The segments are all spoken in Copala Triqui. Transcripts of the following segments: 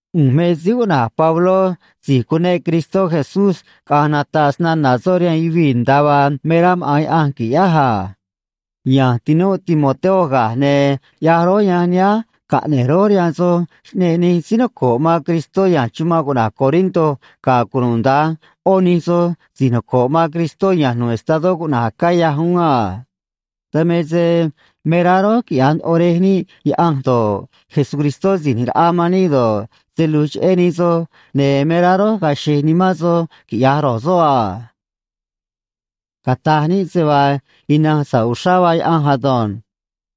ꞌU̱nj me síí cuꞌna̱j Pabló si̱j cuneꞌ Cristó Jesús caꞌa̱nj nata̱ꞌ snana̱ soꞌ rihaan yuvii̱, nda̱a vaa me rá maꞌa̱n Yaꞌanj qui̱ꞌyáj a. Ya̱nj tinúꞌ Timoteo ga̱j, ne̱ ꞌyaj rój yanj nihánj caꞌne̱j rój rihaan soj xꞌneꞌ nij síí noco̱ꞌ man Cristó ya̱nj chumanꞌ cuꞌna̱j Corinto, ga̱ cunuda̱nj ꞌó nij soj si̱j noco̱ꞌ man Cristó ya̱nj nu̱ꞌ estadó cuꞌna̱j Acaya uún a. Dan me se me rá rój quiꞌya̱j ndoꞌo Rej níꞌ Yaꞌanj do̱ꞌ, Jesucristó Si̱j ꞌNi̱j Raꞌa man níꞌ do̱ꞌ, se lu̱j cheꞌé nij soj, ne̱ me rá rój ga̱a̱ xe̱j nimán soj quiꞌya̱j ro̱j soꞌ a. Cata̱j níꞌ se vaa ina̱nj sa̱ꞌ uxrá vaa Yaꞌanj ado̱nj.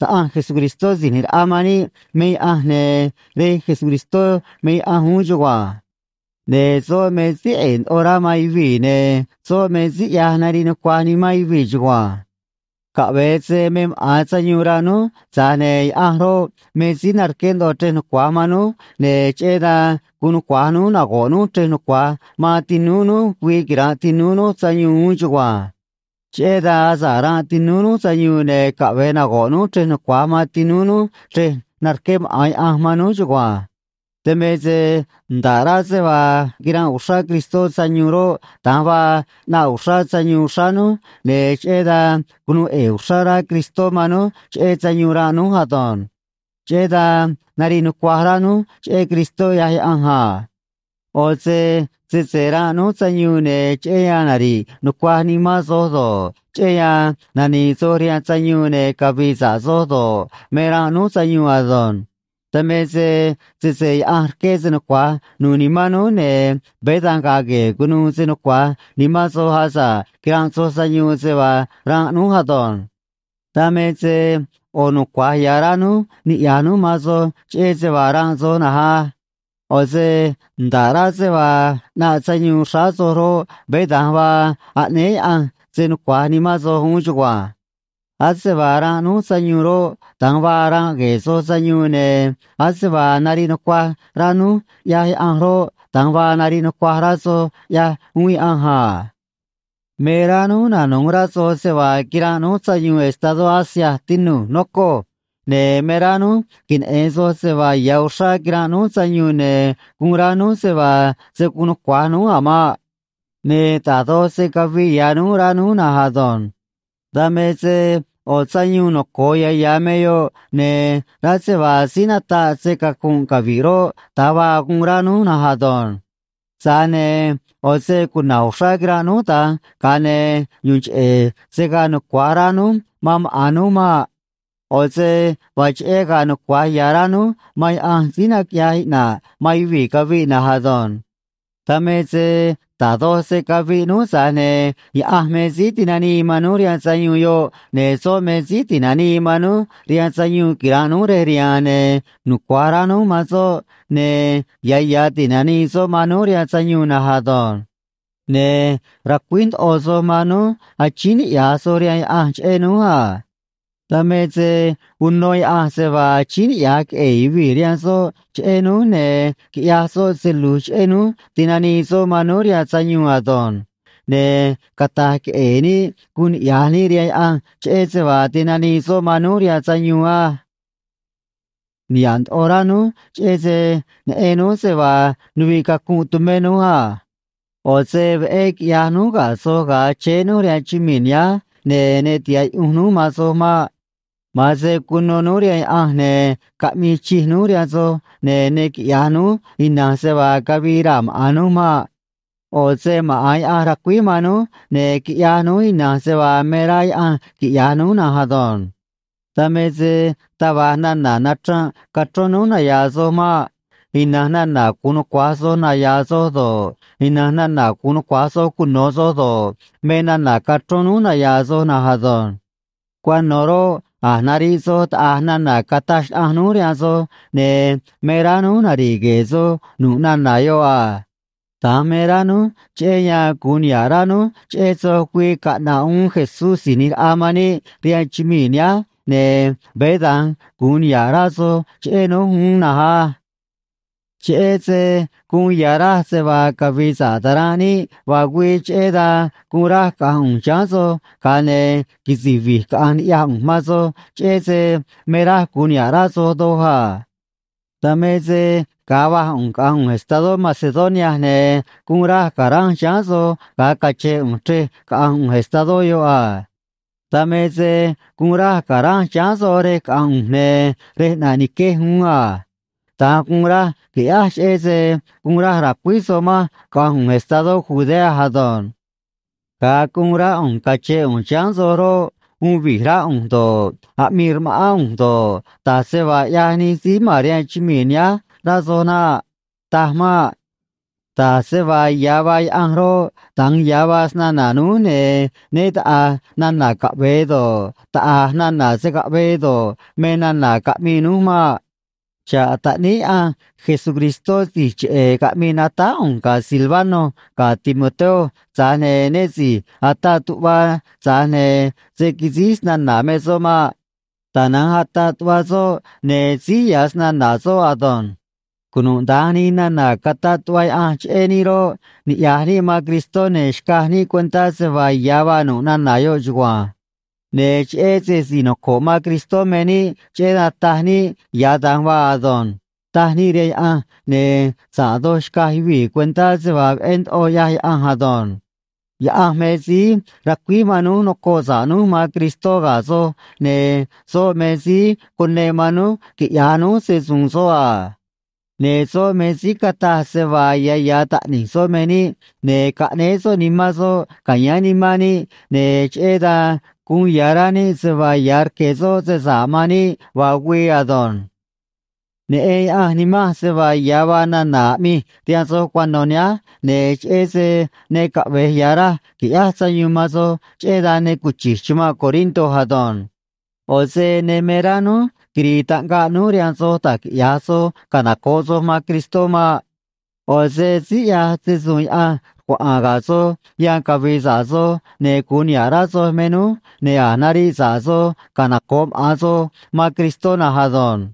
Taꞌanj Jesucristó Si̱j ꞌNi̱j Raꞌa man níꞌ me Yaꞌanj, ne̱ Rej Jesucristó me Yaꞌanj uún chugua̱nj. Ne̱ soꞌ me síí ꞌe̱e̱ ndoꞌo rá man yuvii̱, ne̱ soꞌ me síí ꞌyaj nariꞌ nucuaj nimán yuvii̱ chugua̱nj. Caꞌve̱e se me maꞌa̱n sayuun ranꞌ núj, tza̱j ne̱ Yaꞌanj roꞌ, me síí narqué ndoꞌo chrej nucua̱j man núj, ne̱ cheꞌé dan gu̱un nucua̱j núj nago̱ꞌ núj chrej nucua̱j man tinúú núj güii quira̱nꞌ tinúú núj sayuun uún chugua̱nj. Cheꞌé dan asa̱ꞌ ranꞌ tinúú núj sayuun, ne̱ caꞌve̱e nago̱ꞌ núj chrej nucua̱j man tinúú núj chrej narqué maꞌa̱n Yaꞌanj man núj chugua̱nj. Dan me se nda̱ꞌ rá se vaa quiranꞌ uxrá Cristó sayuun roꞌ, da̱nj vaa ꞌnaꞌ uxrá sayuun xráá núj, ne̱ cheꞌé dan cunuu ꞌe̱e̱ uxrá rá Cristó man núj cheꞌé sayuun ranꞌ núj ado̱nj. Cheꞌé dan nariꞌ nucuaj rá núj cheꞌé Cristó, ꞌyaj Yaꞌanj a. ꞌO̱ se sese ranꞌ núj sayuun, ne̱ cheꞌé yan nari̱ꞌ nucuaj nimán soj do̱ꞌ, cheꞌé yan nani̱i̱ soj rihaan sayuun ne̱ cavi̱i̱ sa̱ꞌ soj do̱ꞌ, me ranꞌ núj sayuun ado̱nj. Dan me se sese Yaꞌanj rqué se nucua̱j nu̱u̱ nimán núj, ne̱ veé da̱nj ga̱a̱ gue̱e̱ cu̱nuû se nucua̱j nimán soj asa̱ꞌ quiranꞌ soj sayuun se vaa ranꞌ núj ado̱nj. Dan me se ꞌo̱ nucua̱j ya̱ rá núj niꞌya̱j núj man soj cheꞌé se vaa ranꞌ soj na̱nj á. ꞌO̱ se nda̱ꞌ rá se vaa ꞌnaꞌ sayuun xráá soj roꞌ, veé da̱nj vaa aꞌnéé Yaꞌanj se nucua̱j nimán soj uún chugua̱nj. Ase vaa ranꞌ núj sayuun roꞌ, da̱nj vaa ranꞌ gue̱e̱ soj sayuun, ne̱ ase vaa nariꞌ nucuaj rá núj ꞌyaj Yaꞌanj roꞌ, da̱nj vaa nariꞌ nucuaj rá soj ꞌyaj uún Yaꞌanj a. Me rá núj nanu̱j rá soj se vaa quiranꞌ núj sayuun estadó Asia, tinu̱j, nocoj. Ne̱ me rá núj queneꞌe̱n soj se vaa ya̱ uxrá quiranꞌ núj sayuun, ne̱ guun rá núj se vaa se̱ guun nucua̱j núj a̱ maꞌ. Ne̱ da̱j doj se caviꞌ ya̱ núj, rá núj na̱nj ado̱nj. Dan me se ꞌo̱ sayuun noco̱o ya̱ ya̱ me yoꞌ, ne̱ rá se vaa síí nataꞌ se‑cacu̱nꞌ cavi̱ꞌ roꞌ, da̱nj vaa guun rá núj na̱nj ado̱nj. Tza̱j ne̱ ꞌo̱ se cuna̱j uxrá quiranꞌ núj da̱nj, ga̱a ne̱ yu̱u̱n cheꞌe̱ se̱ gaa nucua̱j rá núj man maꞌa̱n núj maꞌ. ꞌO̱ se vaa cheꞌé ga̱a̱ nucua̱j ya̱ rá núj man Yaꞌanj síí naquiꞌyaj iꞌna̱ꞌ man yuvii̱ caviꞌ na̱nj ado̱nj. Dan me se da̱j doj se caviꞌ núj, tza̱j ne̱ Yaꞌanj me síí tinanii man núj rihaan sayuun yoꞌ, ne̱ soꞌ me síí ti̱nanii man núj rihaan sayuun quira̱nꞌ núj rej riha̱a̱n, ne̱ nucua̱j rá núj man soꞌ, ne̱ ya̱ ya̱ ti̱nanii soꞌ man núj rihaan sayuun na̱nj ado̱nj. Ne̱ racuíj ndoꞌo soj man núj achíín niꞌya̱j soj rihaan Yaꞌanj cheꞌé núj a. Dan me se uno Yaꞌanj se vaa achíín niꞌya̱j queꞌe̱e̱ yuvii̱ rihaan soꞌ cheꞌé núj, ne̱ quiꞌya̱j soꞌ se lu̱j cheꞌé núj ti̱nanii soꞌ man núj rihaan sayuun ado̱nj. Ne̱ cata̱j queꞌe̱e̱ níꞌ guun niꞌya̱j níꞌ rihaan Yaꞌanj cheꞌé se vaa tinanii soꞌ man núj rihaan sayuun á. Niha̱ꞌ ndoꞌo rá núj, cheꞌé se neꞌen núj se vaa nuviꞌ cacunꞌ tumé núj a. ꞌO̱ se veꞌé quiꞌyaj núj ga̱ soj ga̱a chéé núj rihaan chumii̱ nihánj, ne̱ ne tiha̱ꞌ yuꞌunj núj man soj maꞌ. Ma̱an se cuno núj rihaan Yaꞌanj, ne̱ caꞌmii chij núj rihaan soj, ne̱ ne quiꞌya̱j núj ina̱nj se vaa cavii raa̱ maꞌa̱n núj maꞌ. ꞌO̱ se maꞌa̱n Yaꞌanj racuíj man núj, ne̱ quiꞌyaj núj ina̱nj se vaa me rá Yaꞌanj quiꞌya̱j núj na̱nj ado̱nj. Dan me se taj va̱j nana̱ nachranꞌ cachrón núj naya̱a̱ soj maꞌ. Ina̱nj nana̱ gu̱un nucua̱j soj naya̱a̱ soj do̱ꞌ, ina̱nj nana̱ gu̱un nucua̱j soj cuno̱ soj do̱ꞌ, me nana̱ cachrón núj naya̱a̱ soj na̱nj ado̱nj. Cuano̱ roꞌ, a̱j nariꞌ soj taꞌa̱j nana̱ cataj xnaꞌanj núj rihaan soj, ne̱ me rá núj nari̱ꞌ gue̱e̱ soj nu̱ꞌ nana̱ yoꞌ a. Da̱nj me rá núj, cheꞌé yan gu̱un niha̱ꞌ rá núj cheꞌé soj güii caꞌna̱ꞌ uún Jesús Si̱j ꞌNi̱j Raꞌa man níꞌ rihaan chumii̱ nihánj, ne̱ veé da̱nj gu̱un niha̱ꞌ rá soj cheꞌé núj uún na̱nj á. Cheꞌé se guun ya̱ raj se vaa cavi̱i̱ sa̱ꞌ ta̱ranꞌ níꞌ vaa güii, cheꞌé dan guun raj caꞌa̱nj ꞌu̱nj chiháán soj, ga̱a ne̱ quisi̱j vi̱j caꞌa̱nj ni̱ꞌyaj ꞌu̱nj man soj, cheꞌé se me raj gu̱un niha̱ꞌ rá soj doj a. Dan me se ga̱a va̱j ꞌu̱nj caꞌanj ꞌu̱nj estadó Macedonia, ne̱ guun raj ca̱ranj chiháán soj ga̱a cachén ꞌu̱nj chrej caꞌanj ꞌu̱nj estadó yoꞌ a. Dan me se guun raj ca̱ranj chiháán soj rej caꞌanj ꞌu̱nj ne̱ rej ꞌnaꞌ niquej uún a. Da̱nj guun raj qui̱ꞌyáj cheꞌé se guun raj ra̱cuíj soj manj caꞌa̱nj ꞌu̱nj estadó Judea ado̱nj. Ga̱a guun rá ꞌu̱nj cache̱n ꞌu̱nj chiháán soj roꞌ, uun vi̱j rá ꞌu̱nj do̱ꞌ, aꞌmii rma̱ꞌán ꞌu̱nj do̱ꞌ, da̱j se vaa ꞌyaj nij síí ma̱n rihaan chumii̱ nihánj, rá soj naꞌ. Taj maꞌ. Da̱j se vaa ya̱ vaa Yaꞌanj roꞌ, da̱nj ya̱ vaa snana̱ núj, ne̱ né taꞌa̱j nana̱ “caꞌve̱e” do̱ꞌ, taꞌa̱j nana̱ “se̱ caꞌvee” do̱ꞌ, me nana̱ caꞌmii núj maꞌ. Xa̱ꞌ Taꞌníí Yaꞌanj Jesucristó si̱j cheꞌe̱ caꞌmii natáj ꞌu̱nj ga̱ Silvano ga̱ Timoteo, tza̱j ne̱ né si̱j ataꞌ tuꞌva tza̱j ne̱ se̱ quisíj snana̱ me soꞌ maꞌ. Tana̱nj ataꞌ tuꞌva soꞌ, ne̱ síj ya̱ snana̱ soꞌ ado̱nj. Cunuda̱nj nij nana̱ cataꞌ tuꞌva Yaꞌanj cheꞌé níꞌ roꞌ, niꞌya̱j níꞌ man Cristó ne̱ xcaj níꞌ cuentá se vaa ya̱ vaa nu̱ꞌ nana̱ yoꞌ chugua̱nj. Ne̱ cheꞌé se si̱j noco̱ꞌ man Cristó me níꞌ, cheꞌé dan taj níꞌ “Ya̱ da̱nj vaa ado̱nj”, taj níꞌ rihaan Yaꞌanj, ne̱ sa̱ꞌ doj xcaj yuvii̱ cuentá se vaa veꞌé ndoꞌo ꞌyaj Yaꞌanj ado̱nj. Yaꞌanj me síí racuíj man núj nocoꞌ sa̱ꞌ núj man Cristó ga̱ soj, ne̱ soꞌ me síí cuneꞌ man núj quiꞌya̱j núj se‑su̱u̱n soꞌ a. Ne̱ soꞌ me síí cataj se vaa ya̱ ya̱ taꞌni̱j soꞌ me níꞌ, ne̱ caꞌnéé soꞌ Nimán soꞌ ca̱yáán nimán níꞌ, ne̱ cheꞌé dan guun ya̱ rá níꞌ se vaa ya̱ rque̱ soꞌ se sa̱ꞌ man níꞌ, vaa güii ado̱nj. Neꞌen Yaꞌanj nimanj, se vaa ya̱ vaa nana̱ aꞌmij rihaan soj cuano̱ nihánj, ne̱ cheꞌé se ne caꞌve̱j ya̱ raj qui̱ꞌyáj sayuun man soj, cheꞌé dan ne cuchi̱j chumanꞌ Corinto ado̱nj. ꞌO̱ se ne me rá núj quiri̱i̱ taꞌngaꞌ núj rihaan soj da̱j quiꞌya̱j soj canoco̱ꞌ soj man Cristó maꞌ. ꞌO̱ se síí ꞌyaj se‑su̱u̱n Yaꞌanj rcuaꞌa̱a̱n ga̱ soj yan cavi̱i̱ sa̱ꞌ soj ne̱ gu̱un niha̱ꞌ rá soj me núj, ne̱ a̱j nariꞌ sa̱ꞌ soj canoco̱ꞌ maꞌa̱n soj man Cristó na̱nj ado̱nj.